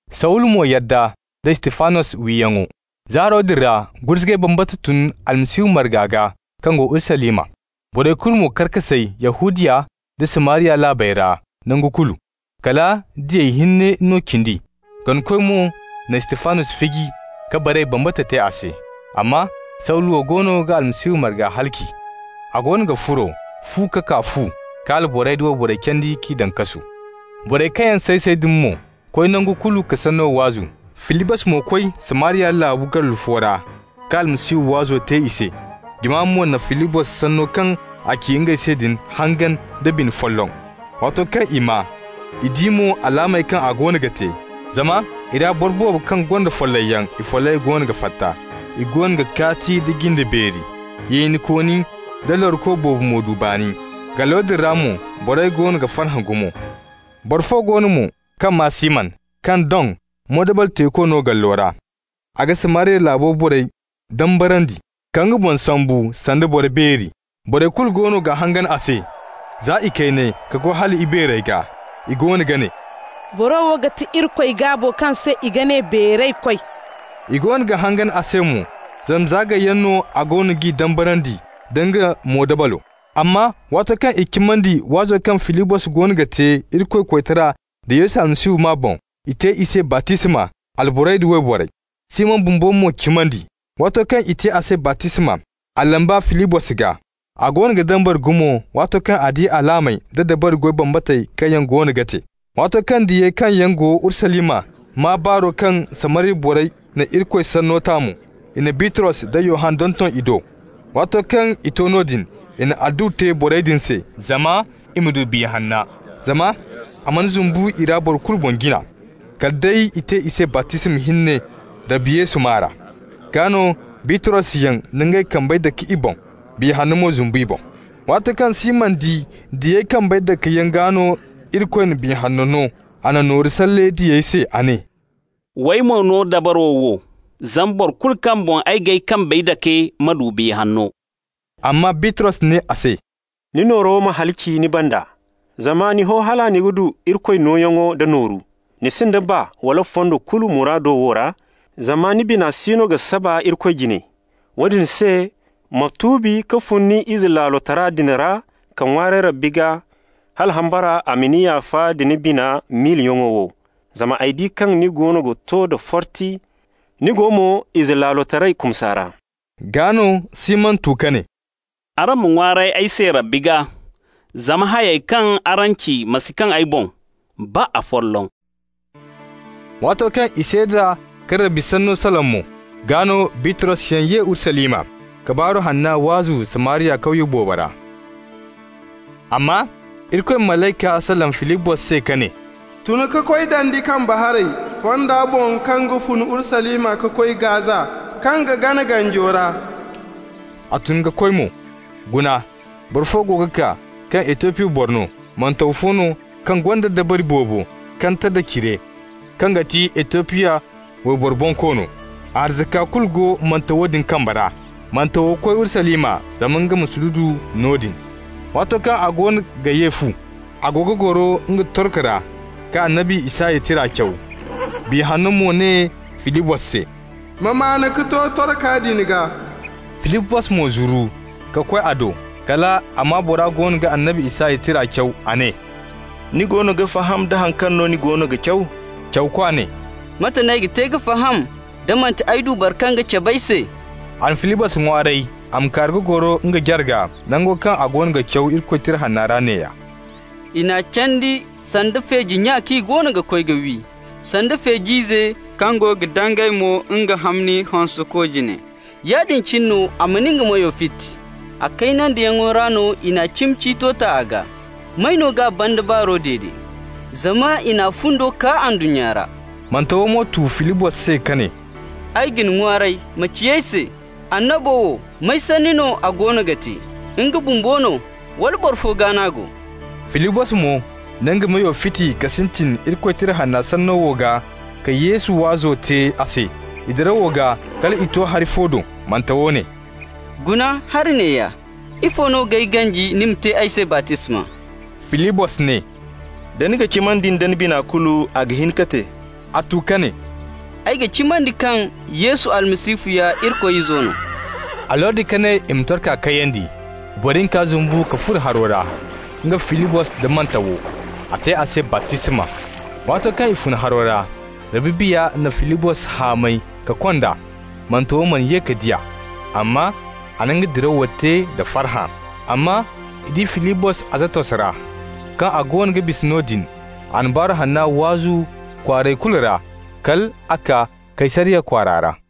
Sawulu mo yadda da Istifanos wiyaŋo. Zaaro din ra gurzugay bambata tun Almasihu marga gaa kaŋ go Urusalima. Borey kulu mo kar ka say-say Yahudiya nda Samariya laabey ra nangu kulu. Kala diyey hinne no cindi. Ganakoy mo na Istifanos fiji ka baray bambata te a se. Amma Sawulu goono ga Almasihu marga halaci. A goono ga furo fu ka kaa fu ka alborey da wayborey candi k'i daŋ kasu. Borey kaŋ yaŋ say-say din mo koy nangu kulu ka Sanno waazu. Filibos mo koy Samariya laabo gallu fo ra ka Almasihu waazo te i se. Jama mo na Filibos sanno kaŋ a ci ngey se din hangan da bina folloŋ, waato kaŋ i maa, i di mo alaamey kaŋ a goono ga te. Zama i ra boro boobo kaŋ gonda follayyaŋ, i follayey goono ga fatta. I goono ga kaati nda jinde beeri. Yeenikooni nda laruko boobo mo du baani. Gallo din ra mo borey goono ga farhã gumo. Boro fo go no mo kaŋ maa Siman, kaŋ doŋ moodabal-teeko no gallo ra. A ga Samariya laabo borey dambarandi, ka nga boŋ sambu sanda boro beeri. Borey kulu goono ga hangan a se, za ikayney ka koy hal ibeerey gaa. I goono ga ne: «Boro wo ga ti Irikoy gaabo kaŋ se i ga ne beeraykoy.» I goono ga hangan a se mo, zama za gayyaŋ no a goono g'i dambarandi nda nga moodabalo. Amma waato kaŋ i cimandi waazo kaŋ Filibos goono ga te Irikoy koytara da Yesu Almasihu maa boŋ, i te i se baptisma, alborey da wayborey. Siman bumbo mo cimandi. Waato kaŋ i te a se baptisma, a lamba Filibos gaa. A goono ga dambara gumo waato kaŋ a di alaamey da dabari goy bambatey kaŋ yaŋ goono ga te. Waato kaŋ diyey kaŋ yaŋ go Urusalima maa baaro kaŋ Samariya borey na Irikoy Sanno ta mo, i na Bitros da Yohanna donton i do. Waato kaŋ i to noodin, i na adduwa te borey din se, zama i ma du Biya Hanna. Zama a mana zumbu i ra boro kulu boŋ jina, kala day i te i se baptisma hinne Rabbi Yesu maa ra. Gaa no Bitrosyaŋ na ngey kambey dake i boŋ, Biya Hanno mo zumbu i boŋ. Waato kaŋ Siman di diyey kambey dakeyaŋ gaa no Irikoy na Biya Hanno no, a na nooru salle diyey se. A ne: «W'ay mo no dabaro wo, zama boro kulu kaŋ boŋ ay ga kambey dake ma du Biya Hanno.» Amma Bitros ne a se: «Ni nooro ma halaci ni banda, zama ni ho hala ni ga du Irikoy nooyaŋo da nooru. Ni sinda baa wala fondo kulu muraado wo ra, zama ni bina siino ga saba Irikoy jine. Woodin se, ma tuubi ka fun ni izelaalotara din ra ka ŋwaaray Rabbi gaa, hala hambara a ma ni yaafa nda ni bina miilayaŋo wo. Zama ay di kaŋ ni goono ga to da forti, ni go mo izelaalotaray kumsa ra.» Gaa no Siman tu ka ne: «Araŋ ma ŋwaaray ay se Rabbi gaa, zama hayey kaŋ araŋ ci ma si kaŋ ay boŋ, baa afolloŋ.» Waato kaŋ i seeda ka Rabbi sanno salaŋ mo, gaa no Bitrosyaŋ ye Urusalima, ka Baaru Hanna waazu Samariya kawye boobo ra. Amma Irikoy malayka salaŋ Filibos se ka ne: «Tun ka koy dandi kambe haray, fonda boŋ kaŋ ga fun Urusalima ka koy Gaza, kaŋ ga gana ganjo ra.» A tun ka koy mo. Guna, boro fo go ga kaa kaŋ Etiyopi boro no, mantaw fo no kaŋ gonda dabari boobo Kandata cire, kaŋ ga ti Etiyopi wayboro bonkoono. A arzaka kulu go mantawo din kamba ra. Mantawo koy Urusalima zama nga ma sududu noodin. Waato kaŋ a goono ga ye fu, a go ga goro nga torko ra ka annabi Isaya tira caw. Biya Hanno mo ne Filibos se: «Ma maan ka to torka din gaa.» Filibos mo zuru ka koy a do. Kal a maa bora goono ga annabi Isaya tira caw. A ne: «Ni goono ga faham da haŋ kaŋ no ni goono ga caw?» Cawka ne: «Mate n'ay ga te ka faham, da manti ay du boro fo kaŋ ga cab'ay se?» A na Filibos ŋwaaray a ma kaaru ka goro nga jarga. Nango kaŋ a goono ga caw Irikoy Tira Hanna ra neeya: «I n'a candi sanda feeji nya kaŋ i goono ga koy wi, sanda feej'ize kaŋ go ga dangay mo nga hamni hõseko jine, yaadin cine no a mana nga meyo fiti. A kaynandiyaŋo ra i n'a cimi ciito ta a gaa. May no g'a banda baaro dede? Zama i n'a fundo kaa ndunnya ra.» Mantawo mo tu Filibos se ka ne: «Ay ga ni ŋwaaray, ma ci ay se: annabo wo, may sanni no a goono ga te? Nga bumbo no, wala boro fo gaa no a go?» Filibos mo na nga meyo fiti ka sintin Irikoy Tira Hanna sanno wo gaa ka Yesu waazo te a se. I dirawo gaa, kal i to hari fo do. Mantawo ne: «Guna hari neeya. Ifo no g'ay ganji ni ma te ay se baptisma?» Filibos ne: «Da ni ga cimandi da ni bina kulu, a ga hin ka te.» A tu ka ne: «Ay ga cimandi kaŋ Yesu Almasihu ya Irikoy Izo no.» A lordi ka ne i ma torka kayandi. I boro hinka zumbu ka furo haro ra, nga, Filibos da mantawo. A te a se baptisma. Waato kaŋ i fun haro ra, Rabbi Biya na Filibos hamay ka kond'a. Mantawo mana ye ka di a, amma a na nga dirawo te da farhã. Amma i di Filibos Azatos ra. Kaŋ a goono ga bisa noodin, a na Baaru Hanna waazu kwaarey kulu ra kal a kaa Kaysariya kwaara.